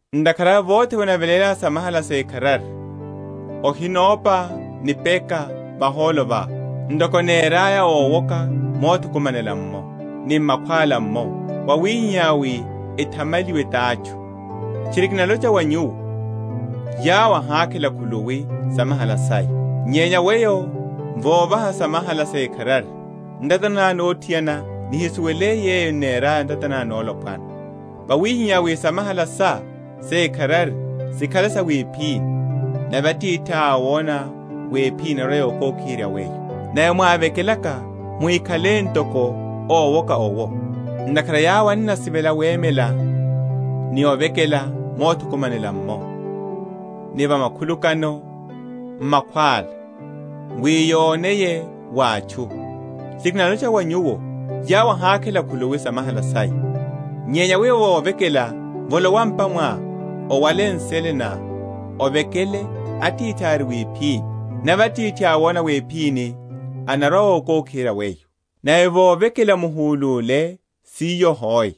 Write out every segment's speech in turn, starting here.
Ntakhara awe vothe vene onavelélá samahala sékharari, ohinopa nipeka vahólo vá, ntoko eneraya ówoka mothukumanela’mmo, ni m’makhwála’mmo, wawihihá wi ethamaliwe t’atchu; Tchiri kinalocha wa nyuwo, Yawo ahakhela khuluwi samahala saya. Nyenya weyo vovaha samahala sékharari, ntata ná nothiana nihisuwele yeyo n’neraya ntata ná nolopwana: wawihihá wi samahala sá sékharari sikhale sa wiphini: nave Atithiá awona wiphini anarwa‐okokiherya weyo. Nave mwavekelaka, muhikhale ntoko ówoka’wo: ntakhara yawo enasivela wemela ni ovekela mothukumanela’mmo, ni va makhulukano a makhwála, wi yoneye wa atchu. Tchiri kinalocha wa nyuwo, yawo ahakhela khuluwi samahala saya. Nyenya weyo vovekela, volowa m’pa mwá, owale nsele ná, ovekele Atithiá ari wiphini, nave Atithiá awona wiphini anarwa‐okokiherya weyo. Nave vovekela muhúluleulule siyo hoe,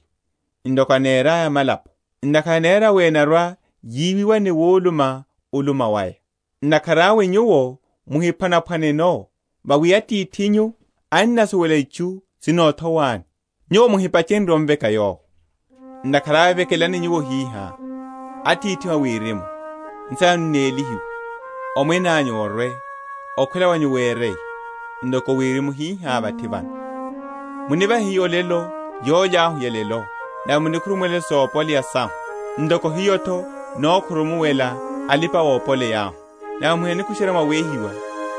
ntoko eneraya amalapo, ntakhara enera wi enarwa‐yiwiwa ni wuluma‐uluma waya. Ntakhara awe nyuwo muhiphwanaphwaneno: Vawi Atithinyu annasuwela itchu sinothowani, nyuwo muhipachenrye omveka Yowo. Ntakhara awe vekelani nyuwo hihá: Atithihu a Wirimu, Nsina nanyu nélihiwe. Omwene anyu orwe. Okhwela wanyu wereye, ntoko Wirimu hihá vathi vano. Munivahe hiyo olelo yólya yahu ya’lelo. Nave munikhurumuwele sopoleya sahu, ntoko hiyo’tho nokhurumuwela alipa‐opoleyahu. Nave muhinani‐kusherya mwa wéhiwa,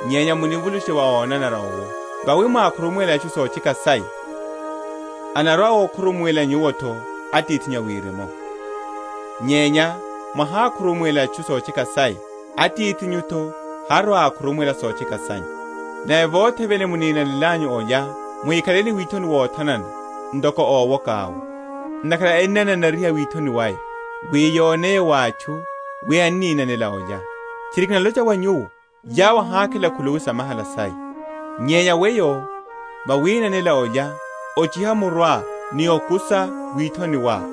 nyenya munivulushe wa ónanara owo. Vawi mwakhurumuwela atchu sotcheka saya anarwa‐akhurumuwela nyuwo’tho Atithinyu a Wirimu. Nyenya mwahikhurumuwela atchu sotcheka saya, Atithinyu’tho harwa‐akhurumuwela sotcheka sanyu. Nave vothe vene muninanelanyu olya, muhikhale ni withoni wothanana, ntoko ówoka’wo: ntakhara ennananariha withoni waya, wi yoneye wa atchu wi enninanela olya. Tchiri kinalocha wa nyuwo, Yawo ahakhela khuluwi samahala saya. Nyenya weyo, vawinanela olya, ochiha muruá, ni okusa withoni wá: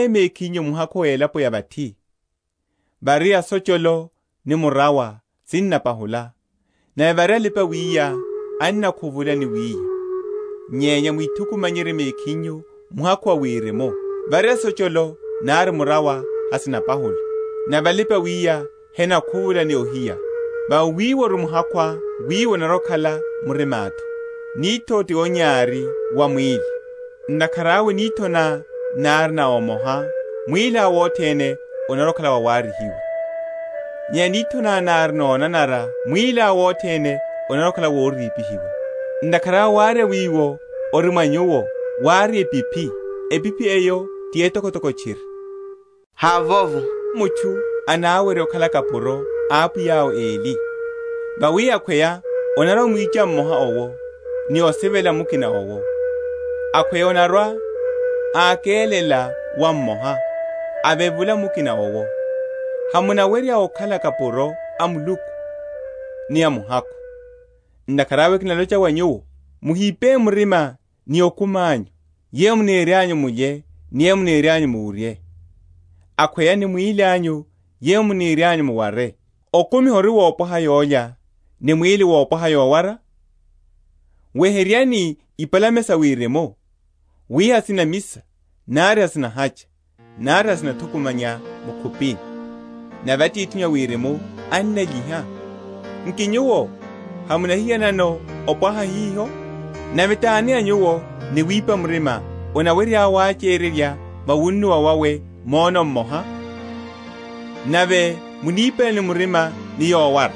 Muhíthukumanyerye mekhinyu muhakhu va elaponi ya vathi, vári asocholo ni murawa sinnapahula; nave vári alipa‐wiya ennakhuvula ni wiya: nyenya mwithukumanyerye mekhinyu muhakhu Wirimu, vári asocholo nari murawa hasinapahula, nave alipa‐wiya henakhuvula ni ohíya: vawi wiwo ori muhakhuá, wiwo onarwa‐okhala murimá’tho. Nitho’ti onyari wa mwíli: ntakhara awe nitho ná nári na omoha, mwíliá wothene onarwa‐okhala wawaryihiwa. Nyenya nitho ná nári nonanara, mwíliá wothene onarwa‐okhala worípihiwa. Ntakhara awe warya wiwo ori mwa nyuwo wári epiphi, epiphi eyo ti etokotoko tchiri! Hávovo mutchu anawerye okhala kapuro a apwiya awe eli: vawi akhweya anarwa‐amwicha mmoha owo, ni osivela mukina owo; akhweya anarwa‐ákelela wa mmoha, avevula mukina owo. Hamuwerya okhala kapuro a Muluku ni a Muhakhu. Ntakhara awe kinalocha wa nyuwo, muhipe murima ni okumi anyu, yeyo munirianyu mulye ni yeyo munirianyu muwurye; akhweya ni mwíli anyu, yeyo munirianyu muware. Okumi hori wopwaha yólya, ni mwíli wopwaha yowara? Weheryani ipalame sa Wirimu, wi hasinamisa, nari hasinahacha, nari hasinathukumanya mu’khupini; nave Atithinyu a Wirimu annalyiha. Nki nyuwo hamunahiyanano opwaha hiho? Nave tani a nyuwo ni wipa murima anawerye wachererya va wunnuwa wawe mwono mmoha? Nave munipelani murima ni yowara?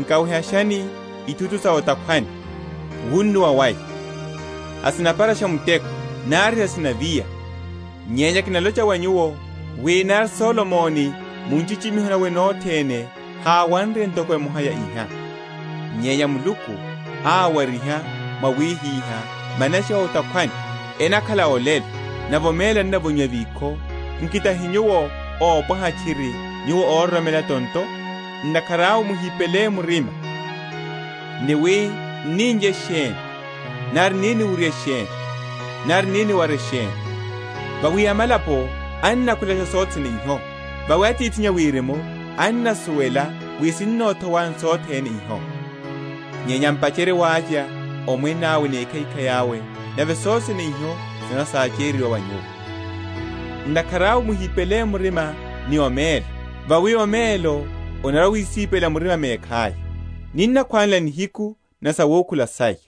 Nkawehashani ithutu sa o’takhwani, wunnuwa waya; hasinapharasha muteko, nari hasinaviya: nyenya kinalocha wa nyuwo, wi nari Solomoni mu nchichimiho nawe nothene háwanre ntoko emoha ya hiha. Nyenya Muluku awariha wawihiha manashi a o’takhwani, enakhala olelo, nave omelo evonyiwa vikho, nki tahi nyuwo opwaha tchiri, nyuwo ororomela tonto? Ntakhara awe muhipele murima, ni wi, N’ni‐n’lye sheni? nari, N’ni‐niwurye sheni? nari N’ni‐niware sheni? Vawi amalapo enakhwelasha sothene iho; vawi Atithinyu a Wirimu annasuwela wi sinnothowani sothene iho. Nyenya m’pacherye wavya Omwene awe ni ekhaikhai awe, nave sothe sene iho sinarwa‐sachereryiwa wa nyuwo. Ntakhara awe muhipele murima ni omelo: vawi omelo onarwa‐wisípela murima mekhaya. Ninnakhwanela nihiku ni sawukhula saya.